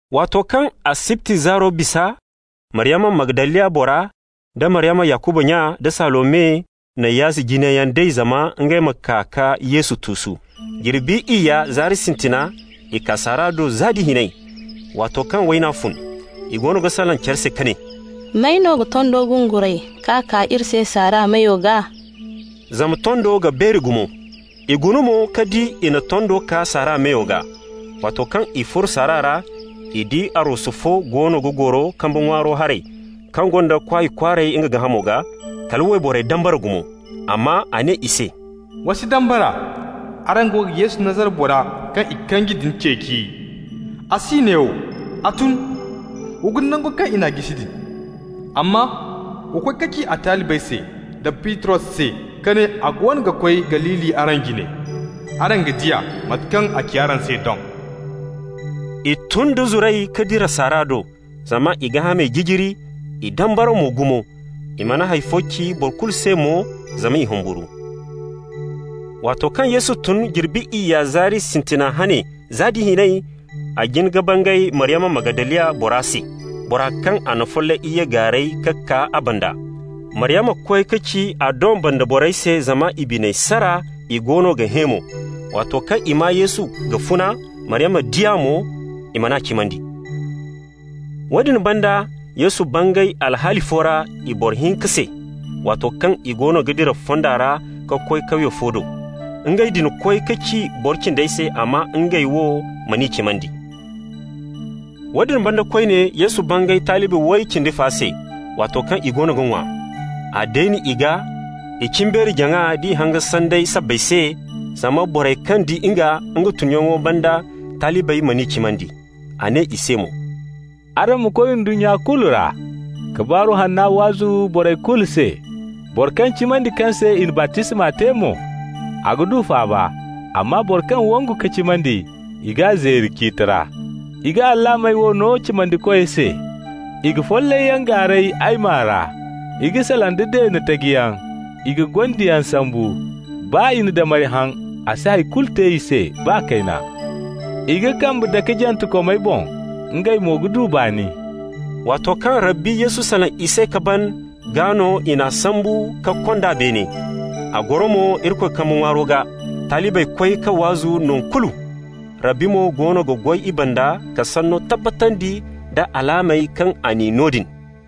Waato kaŋ asibti zaaro bisa, Maryama Magdaliya bora, da Maryama Yakuba nya, da Salome na yaazi jinayyaŋ day zama ngey ma kaa ka Yesu tuusu. Jirbi iyya zaari sintina i kaa saara do za nda hinay, waato kaŋ wayna fun. I goono ga salaŋ care se ka ne: «May no ga tondo gunguray ka kaa iri se saara meyo gaa?» Zama tondo ga beeri gumo. I guna mo, ka di i na tondo kaa saara meyo gaa. Waato kaŋ i furo saara ra, i di arwasu fo goono ga goro kambe ŋwaaro haray, kaŋ gonda kwaay kwaaray nga gaahamo gaa. Kala wayborey dambara gumo. Amma a ne i se: «Wa si dambara. Araŋ go ga Yesu Nazara bora kaŋ i kanji din ceeci. A si neewo, a tun. Wa guna nango kaŋ i n'a jisi din. Amma wa koy ka ci a talibey da Bitros se ka ne a goono ga koy Galili araŋ jine. Araŋ ga di a, mate kaŋ a ci araŋ se doŋ.» I tun da zuray ka dira saara do, zama i gaahamey jijiri, i dambara mo gumo. I mana hay fo ci boro kulu se mo, zama i humburu. Waato kaŋ Yesu tun jirbi iyya zaari sintina hane za da hinay, a jin ka bangay Maryama Magdaliya bora se, bora kaŋ a na follay iyye gaaray ka kaa a banda. Maryama koy ka ci a doŋ banda borey se, zama i biney sara, i goono ga hẽ mo. Waato kaŋ i maa Yesu ga funa, Maryama di a mo, i man'a cimandi. Woodin banda Yesu bangay alhaali fo ra i boro hinka se, waato kaŋ i goono ga dira fonda ra ka koy kawye fo do. Ngey din koy ka ci boro cindey se, amma ngey wo man'i cimandi. Woodin banda koyne Yesu bangay talibi way cindi fa se, waato kaŋ i goono ga ŋwa. A deeni i gaa i cimbeeri-jaŋa d'i hanga sanday sabbay se, zama borey kaŋ di nga, nga tunyaŋo banda, talibey man'i cimandi. A ne i se mo: «Araŋ ma koy ndunnya kulu ra, ka Baaru Hanna waazu borey kulu se. Boro kaŋ cimandi, kaŋ se i na baptisma te mo, a ga du faaba, amma boro kaŋ wangu ka cimandi, i g'a zeeri ciiti ra. I ga alaamey wo no cimandikoy se: i ga follayyaŋ gaaray ay maa ra, i ga salaŋ da deene tajiyaŋ, i ga gondiyaŋ sambu. Baa i na damari haŋ, a si hay kulu te i se baa kayna. I ga kambe dake jantekomey boŋ, ngey mo ga du baani.» Waato kaŋ Rabbi Yesu salaŋ i se ka ban, gaa no i n'a sambu ka kond'a beene. A goro mo Irikoy kambe ŋwaaro gaa. Talibey koy ka waazu nangu kulu, Rabbi mo goono ga goy i banda ka sanno tabbatandi nda alaamey kaŋ a n'i no din.